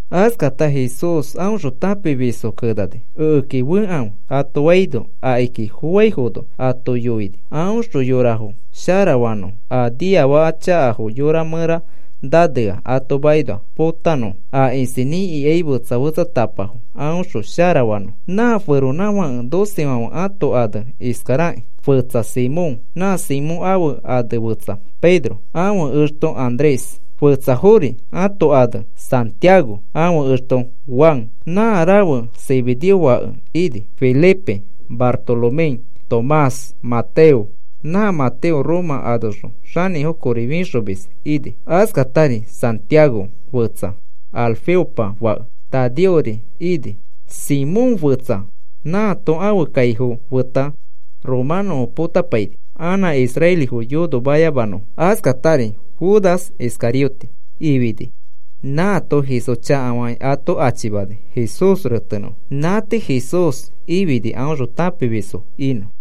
Askata Jesús aõxõ tãpimisfo kenani: “Ekeki fekãfe,” ato faino, akiki foaifono ato yoini aõxõ yorafo sharafanõfo, a niafaka chakafo yorafo mẽra nanea ato makinoa potanõfo, a isinĩ ikaifo fetsa fetsatapafo aõxõ sharafanõfo. Nã feronãfake docefãfe ãto anefo iskarakĩ: fetsa Simón. Nã Simón ãfe ane fetsa Pedro. Ãfe exto Andrés. Fetsafori ãto ane Santiago, ãfe exto Juan, nã rafe Zebedeo fake ini. Felipe, Bartolomé, Tomás, Mateo, nã Mateo Roma anoxõ xanĩfo kori fixomis ini. Askatari Santiago fetsa, Alfeopa fake, Tadeori ini. Simón fetsa nãato ãfe kaifo feta romanõfo potapaini anã israelifo yonomayamanõfo. Askatari Judas Iscarioteri ifini, nãato Jesús chakafakĩ ato achimani Jesús retenõfo. Nã tii Jesús ifini aõxõ tãpimiskõi inõfo.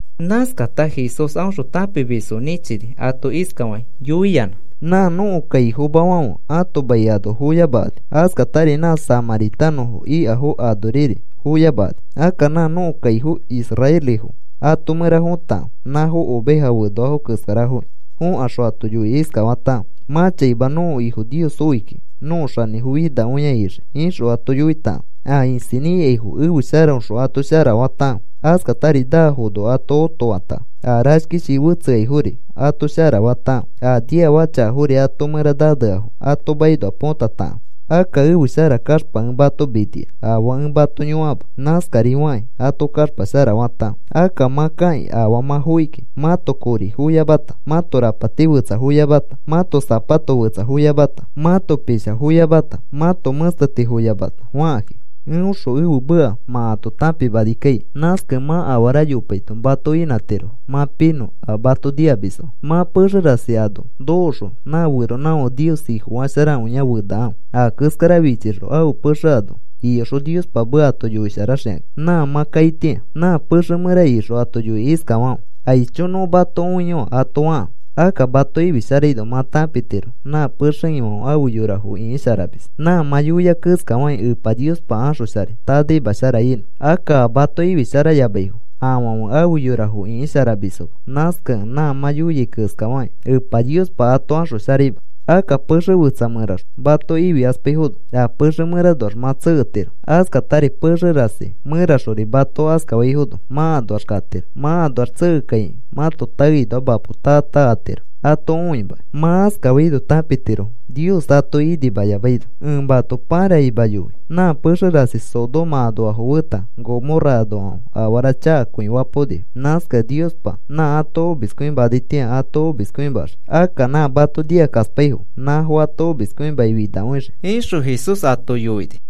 Nãskata Jesús aõxõ tãpimisfo nĩchini ato iskafakĩ yoiyanã: “Nã nõko kaifomafãfe ãto mai ano foyamakani. Askatari nã samãritanõfo ikafo anoriri foyamakani. Akka nã nõko kaifo israelifo ato mẽra fotakãfe. Nãfo oveja fenoafo keskarafokĩ. Fokaxõ ato yoikĩ iskafatakãfe: ‘Mã chaima nõko Ifo Nios oi kiki nõko xanĩfo finakõia ixii,’ ixõ ato yoitakãfe. A isinĩ ikaifo ẽfe sharaõxõ ato sharafatakãfe. Askatari naafono ato otofatakãfe. A rashkishii fetseaifori ato sharafatakãfe. A niafaka chakafori ãto mẽra naneafo ato makinoa põtatakãfe. Akka ẽfe shara kaxpa ẽ mato minia afaa ẽ mato yõkama. Nãskari fakĩ, ato kaxpa sharafatakãfe. “Akka mã kakĩ afaa mã fokiki. Mãto kori foyamata, mãto rapati fetsa foyamata, mãto sapato fetsa foyamata, mãto forosa foyamata, mãto mẽsteti foyamata fakãki, eõxõ ẽfe meka mã ato tãpimani kaikai. Nãskakẽ mã afara yopaito mato inãtirofo mã pinõ a mato nikamisfãfe. “Mã pexe rasi ano nokoxõ nã feronãfãke Nios Ifofasharakõia fenakãfe. A keskara fichixõ ãfe pexe ano iyoxõ Niospa meka ato yoisharaxikaki nã mã kaitĩa. Nã pexe mẽra ikixõ ato yoikĩ iskafakãfe: ‘Aicho. Nõ mato õiyoa,’ ato fakãfe. Akka mato ifisharaino, mã tãpitiro nã pexe ifãfe afe yorafo ĩkisharamis. Nã mã yoiai keskafakĩ Epa Niospa axosharai tanaima shara inõ. Akka a mato ifisharayamaifo, afãfe afe yorafo ĩkisharamisfoma. Nãskakẽ nã mã yoiai keskafakĩ Epa Niospa ato axosharaima. Akka pexe fetsa mẽraxõ mato ifikaspaifono, a pexe mẽranoax mã tseketiro. Askatari pexe rasi mẽraxori mato askafaifono, mã anoax katiro. Mã anoax tsekekaikĩ mãto taekinoa mã mapo taa taa atiro ato õimakĩ. Mã askafaino tãpitirofo Nios atoki inimayamaino. Ẽ mato paraima yoi. Nã pexe rasi Sodoma anoafo feta Gomorra anoafãfe afara chakakõi fapaonifo. Nãskakẽ Niospa nã ato omiskõimanaitĩa ato omiskõimaxii. Akka nã mato nikakaspaifo nãfo ato omiskõimaki finakõixii,” ixõ Jesús ato yoini.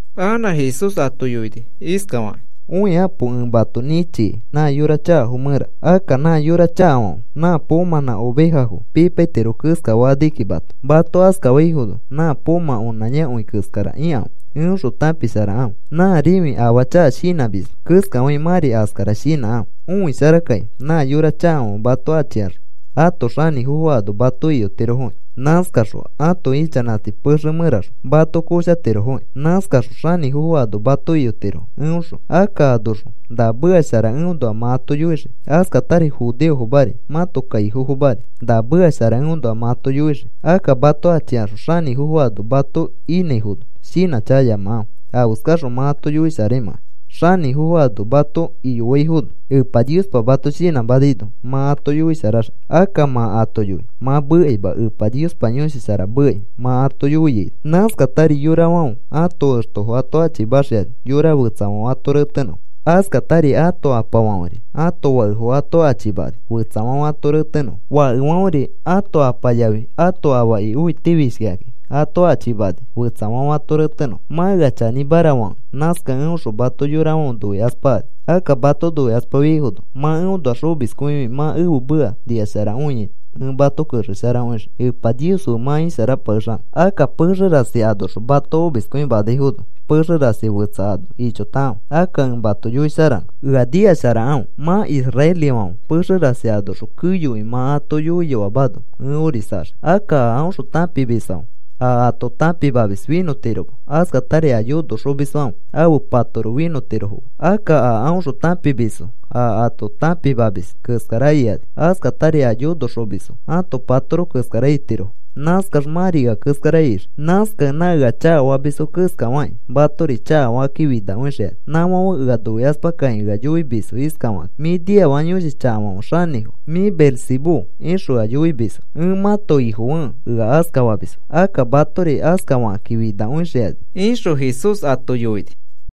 Anã Jesús ato yoini iskafakĩ: “Õikapo. Ẽ mato nĩchikai nã yora chakafo mẽra. Akka nã yora chakafãfe nã poomãnã ovejafo pipaitiro keskafakani kiki mato. Mato askafaifono nã poomã onãyakõi keskara ikãfe eõxõ tãpisharakãfe. Nã rĩfi afaa chaka shinãmisma keskafakĩ mãri askara shinãkãfe. Õisharakaki. Nã yora chakafãfe mato achikaxõ ãto xanĩfofo ano mato iyotirofoki. Nãskakaxõ ãto ichanãti pexe mẽraxõ mato koshatirofoki. Nãskakaxõ xanĩfofo ano mato iyotirofo eõxõ. Akka anoxõ na meka shara eõnoa mã ato yoixii. Askatari judeofomari mãto kaifomafori na meka shara eõnoa mã ato yoixii. Akka mato achikaxõ xanĩfofo ano mato inãifono shinãchakayamakãfe afeskaxõ mã ato yoisharaimãkai. Xanĩfofo ano mato iyofaifono Epa Niospa mato shinãmanaino mã ato yoisharaxii. Akka mã ato yoi mã mekaima Epa Niospa Yõshi Shara mekai mã ato yoiaino. “Nãskatari yorafãfe ãto extofo ato achimaxikani, yora fetsafãfe ato retenõfo. Askatari ato apafãferi ãto fakefo ato achimakani fetsafãfe ato retenõfo. Fakefãferi ãto apa yafi ãto afaki õitifishkikakĩ ato achimakani fetsafãfe ato retenõfo. Mã ea chanĩmara fakẽ nãskakẽ eõxõ mato yorafãfe noikaspakani. Akka mato noikaspafiaifono mã eõnoax omiskõifikĩ mã ẽfe meka nikasharakõiaito ẽ mato kexesharakõixii Epa Nios fe mã isharapakexanõ. Akka pexe rasi anoxõ mato omiskõimanaifono, pexe rasi fetsa ano ichotakãfe. Akka ẽ mato yoisharanõ. Ea nikasharakãfe. Mã israelifãfe pexe rasi anoxõ keyokõi mã ato yoiyoamano, ẽ orisaxii. “Akka a aõxõ tãpimisfãfe a ato tãpimamis finõtirofoma. Askatari a yonoxomisfãfe ãfe patoro finõtirofoma. Akka a aõxõ tãpimisfo a ato tãpimamis keskara ikani. Askatari a yonoxomisfo ãto patoro keskara itirofo. Nãskax mãri ea keskara ixii. Nãskakẽ nã ea chakafamisfo keskafakĩ matori chakafakakĩ finakõixikani. Nãfãfe ea noikaspakakĩ ea yoimisfo iskafakakĩ: ‘Mĩ niafaka yõshi chakafãfe xanĩfo. Mĩ Beelzebú,’ ixõ ea yoimisfo. Ẽ mãto Ifofekẽ ea askafamisfo. Akka matori askafakakĩ finakõixikani,” ixõ Jesús ato yoini.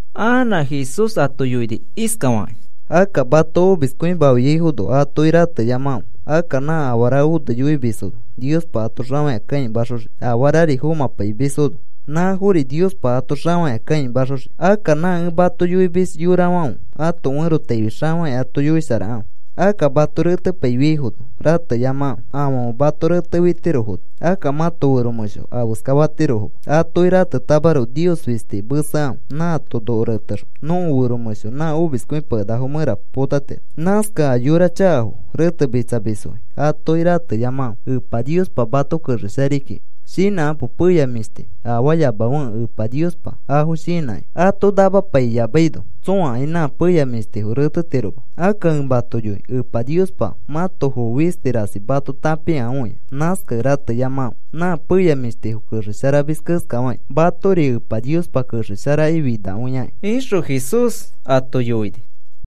Anã Jesús ato yoini iskafakĩ: “Akka mato omiskõimafiaifono, atoki rateyamakãfe. Akka nã afara one yoifimisfono Niospa ato xafakĩa kãimaxoxii, afarari fomãpaimisfono, nãfori Niospa ato xafakĩa kãimaxoxii. Akka nã ẽ mato yoimis yorafãfe ato ferotaifi xafakĩa ato yoisharakãfe. Akka mato retepaifiaifono rateyamakãfe. Afãfe mato retefitirofono, akka mãto fero mẽsho afeska fatirofoma. Atoki ratetamaroko, Nios fistiki mesekãfe. Nãato noko retexõ nõko fero mẽsho nã omiskõipakenakafo mẽra potatiro. “Nãskakẽ a yora chakafo retemitsamisfoki atoki rateyamakãfe. Epa Niospa mato kexesharai kiki. Shinãkapo. Peya mĩshti afaayamafekẽ Epa Niospa afo shinãki. Ato namapaiyamaino tsõakai nã peya mĩshtifo retetiroma. Akka ẽ mato yoi, Epa Niospa mãto foo fisti rasi mato tãpikakõia. Nãskakẽ rateyamakãfe. Nã peya mĩshtifo kexesharamis keskafakĩ, matori Epa Niospa kexesharakĩ finakõiakĩ,” ixõ Jesús ato yoini.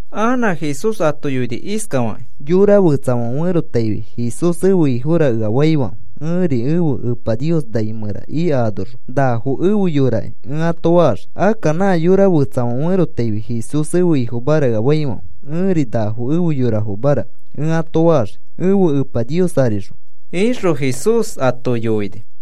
Anã Jesús ato yoini iskafakĩ: “Yora fetsafãfe ferotaifi, ‘Jesús ẽfe Ifora’ ea faifãfe ẽri ẽfe Epa Nios nai mẽra ika anoxõ, ‘Nafo efe yoraki’ ẽ ato faxii. Akka nã yora fetsafãfe ferotaifi, ‘Jesús ẽfe Ifomara’ ea faifãfe ẽri, ‘Nafo efe yorafomara’ ẽ ato faxii ẽfe Epa Nios arixõ,” ixõ Jesús ato yoini.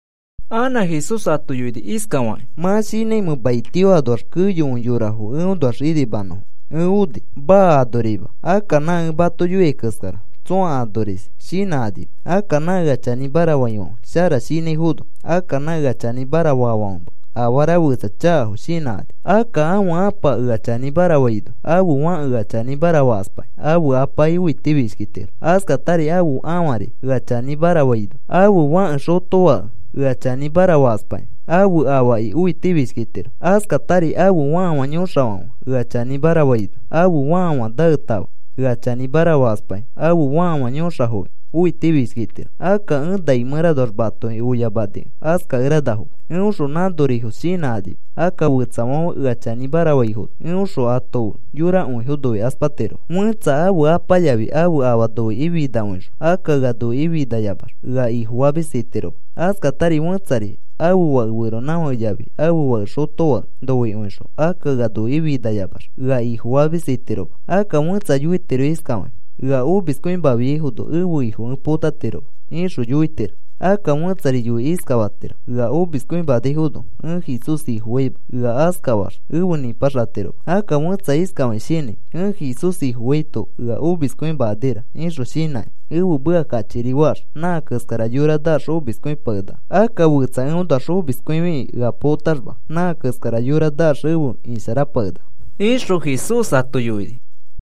Anã Jesús ato yoini iskafakĩ: “¿Mã shinãimẽ maitio anoax keyokõi yorafo eõnoax inimanõfo ẽ oni? Maa. Anorima. Akka nã ẽ mato yoiai keskara tsõa anoris shinãkanima. Akka nã ea chanĩmara faifãfe shara shinãifono akka nã ea chanĩmara faafãfema afara fetsa chakafo shinãkani. Akka ãfe apa ea chanĩmara faino ãfe fãke ea chanĩmara fakaspakĩ ãfe apaki õitifishkitiro. Askatari ãfe ãfari ea chanĩmara faino ãfe fake xotofãke ea chanĩmara fakaspakĩ ãfe afaki õitifishkitiro. Askatari ãfe fãfafa yõxafãfe ea chanĩmara faino, ãfe fãfafa naetãfa ea chanĩmara fakaspakĩ, ãfe fãfafa yõxafoki õitifishkitiro. Akka ẽ nai mẽranoax matoki oyamanikẽ askakeranafoma. Eõxõ nãnorifos shinãkanima. Akka fetsafãfe ea chanĩmara faifono eõxõ ato fe yorakõifo noikaspatirofo. “Fẽtsa ãfe apa yafi ãfe afa noikĩ finakõixõ akka ea noikĩ finayamax, ea Ifofamis itiroma. Askatari fẽtsari ãfe fake feronãfake yafi ãfe fake xotofake noikõixõ, akka ea noikĩ finayamax ea Ifofamis itiroma. Akka fẽtsa yoitiro iskafakĩ: ‘Ea omiskõimafiaifono ẽfe Ifo ẽ potatiroma,’ ixõ yoitiro. Akka fẽtsari yoikĩ iskafatiro: ‘Ea omiskõimanaifono ẽ Jesús Ifofaima,’ ea askafax efe nĩpaxatiroma. Akka fẽtsa iskafakĩ shinãi: ‘Ẽ Jesús Ifofaito ea omiskõimakanira,’ ixõ shinãkĩ, ẽfe meka kachikiri faax, nã keskara yora naax omiskõipakenaka. Akka fetsa eõnoax omiskõifikĩ ea potaxma nã keskara yora naax efe isharapakenaka,” ixõ Jesús ato yoini.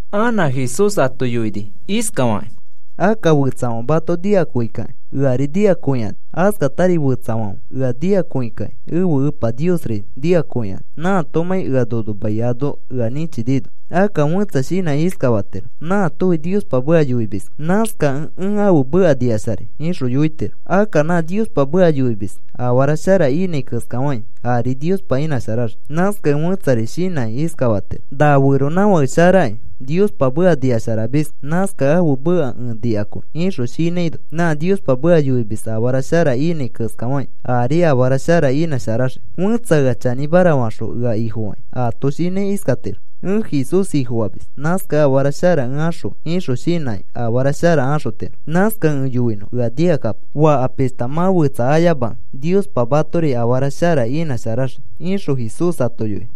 Anã Jesús ato yoini iskafakĩ: “Akka fetsafãfe mato nikakõikakĩ eari nikakõikani. Askatari fetsafãfe ea nikakõikakĩ ẽfe Epa Niosri nikakõikani nãatomãi ea nono mai ano ea nĩchinino. Akka fẽtsa shinãkĩ iskafatiro: ‘Nãatofi Niospa meka yoimiski. Nãskakẽ ẽ ãfe meka nikasharai,’ ixõ yoitiro. Akka nã Niospa meka yoimis afara shara inãi keskafakĩ ari Niospa inãsharaxii. Nãskakẽ fẽtsari shinãkĩ iskafatiro: ‘Nã feronãfake sharaki Niospa meka nikasharamiski. Nãskakẽ ãfe meka ẽ nikakõi,’ ixõ shinãino, nã Niospa meka yoimis afara shara inãi keskafakĩ ari afara shara inãsharaxii. Fẽtsa ea chanĩmara faxõ ea Ifofakĩ, aato shinãi iskatiro: ‘Ẽ Jesús Ifofamis. Nãskakẽ afara shara ẽ axõi,’ ixõ shinãkĩ afara shara axotiro. Nãskakẽ ẽ yoinõ, ea nikakapo. Faka pishta mã fetsa ayamakẽ Niospa matori afara shara inãsharaxii,” ixõ Jesús ato yoini.